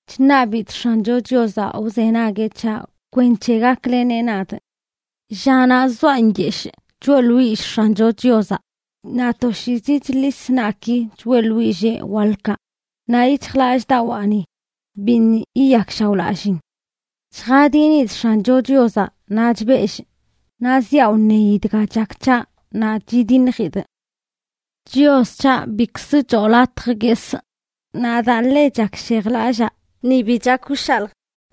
Chṉabidꞌ X̱ancho Chiozaꞌ wzenagueꞌ c̱haꞌ kwenc̱he gakleneꞌ nadꞌ. Llanaꞌ zoaꞌ nyeshꞌ, choeꞌḻwillꞌ X̱ancho Chiozaꞌ, naꞌ toshiizi chḻis naꞌki choeꞌḻwillee waḻkaꞌ, naꞌ yic̱hjlallꞌdawaani biṉꞌ yiyakshaoꞌlalliin. Chjadinidꞌ X̱ancho Chiozaꞌ naꞌ chbellꞌ; naꞌ ziaꞌ wṉeyi dga chak c̱haꞌ naꞌ chidiṉjidꞌ. Chios c̱haꞌ, bikz choo latj guesꞌ; naꞌ daa ḻe chakshejlallaa, ni bi chak wshaljꞌ.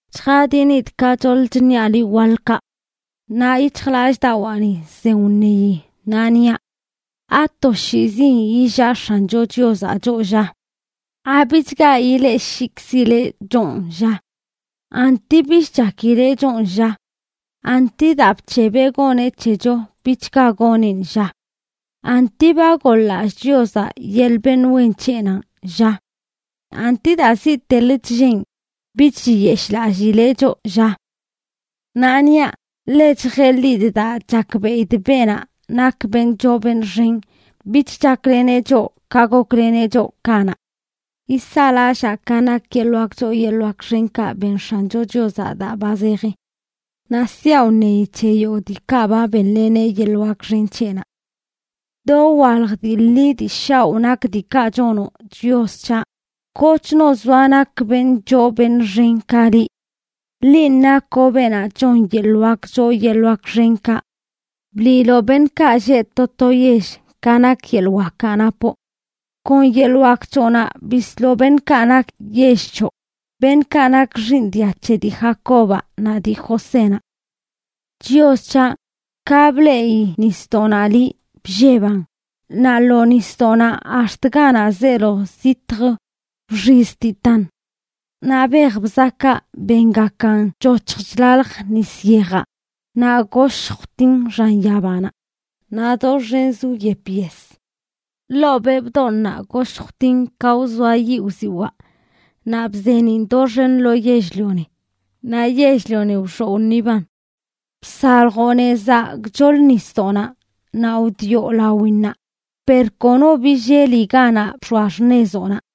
Chjadinidꞌ ka choḻ chṉiaꞌ liꞌ waḻkaꞌ. Naꞌ yic̱hjlallꞌdawaani zen wṉeyi, naꞌ niaꞌ: ¿Atoshiizin illaa X̱ancho Chiozaꞌ choꞌ, lla? ¿Abichga yileꞌshikzileꞌ chonꞌ, lla? ¿Anti bich chakileꞌ chonꞌ, lla? ¿Anti daa bc̱hebeꞌ goneꞌ c̱hecho bichga goneꞌn, lla? ¿Anti ba goḻ-lallꞌ Chiozaꞌ yeḻꞌ beṉꞌ wen c̱heꞌnanꞌ, lla? ¿Anti daa ziꞌtelə chlleen, bich chiyeshꞌlallileꞌ choꞌ, lla? Naꞌ niaꞌ: “Ḻe chjeḻidꞌ daa chakbeꞌidꞌ beenaꞌ nak beṉꞌ choo beṉꞌ xen bich chakleneꞌ choꞌ ka gokleneꞌ choꞌ kanaꞌ.” Yisaꞌlallaa ka nak yeḻꞌ wak choo yeḻꞌ wak xenkaꞌ ben X̱ancho Chiozaꞌ daa ba zeji. Naꞌ siaꞌ wṉeyi c̱he yogꞌ diikaꞌ ba benleneꞌ yeḻꞌ wak xen c̱heꞌnaꞌ. Dowalj dii ḻi dii shaoꞌ nak diikaꞌ chonoꞌ, Chios c̱haꞌ; kochno zoa nak beṉꞌ choo beṉꞌ xen ka liꞌ. Linꞌ nakoꞌ beenaꞌ chon yeḻꞌ wak choo yeḻꞌ wak xenkaꞌ; bliiloꞌ beṉꞌkaꞌ lleꞌ to to yell ka nak yeḻꞌ wakaꞌ napoꞌ. Kon yeḻꞌ wak c̱hoꞌnaꞌ bisloꞌ beṉꞌkaꞌ nak yell c̱hoꞌ, beṉꞌkaꞌ nak x̱iin dia c̱he dii Jacobaꞌ naꞌ dii Josénaꞌ. Chios c̱haꞌ, ka bleꞌi nisdoꞌnaꞌ liꞌ, blleban, naꞌ lo nisdoꞌnaꞌ ax̱t ganaꞌ zeelo zitj wxiztitan. Naꞌ bej bzakaꞌ bengakan choc̱hj chlalj nis yejaꞌ, naꞌ goshj wtin xan yabanaꞌ naꞌ doxenz wyep yes. Ḻoo beꞌ bdooṉnaꞌ goshj wtin ka wzoa yiꞌ wziwaꞌ, naꞌ bzeeniꞌn doxen lo yell-lioni, naꞌ yell-lioni wxoꞌ wṉiban. Bsaljoꞌ nezaꞌ gchoḻ nisdoꞌnaꞌ naꞌ wdioꞌ lawinnaꞌ, per kono billeli ganaꞌ bx̱oa xṉezoꞌnaꞌ.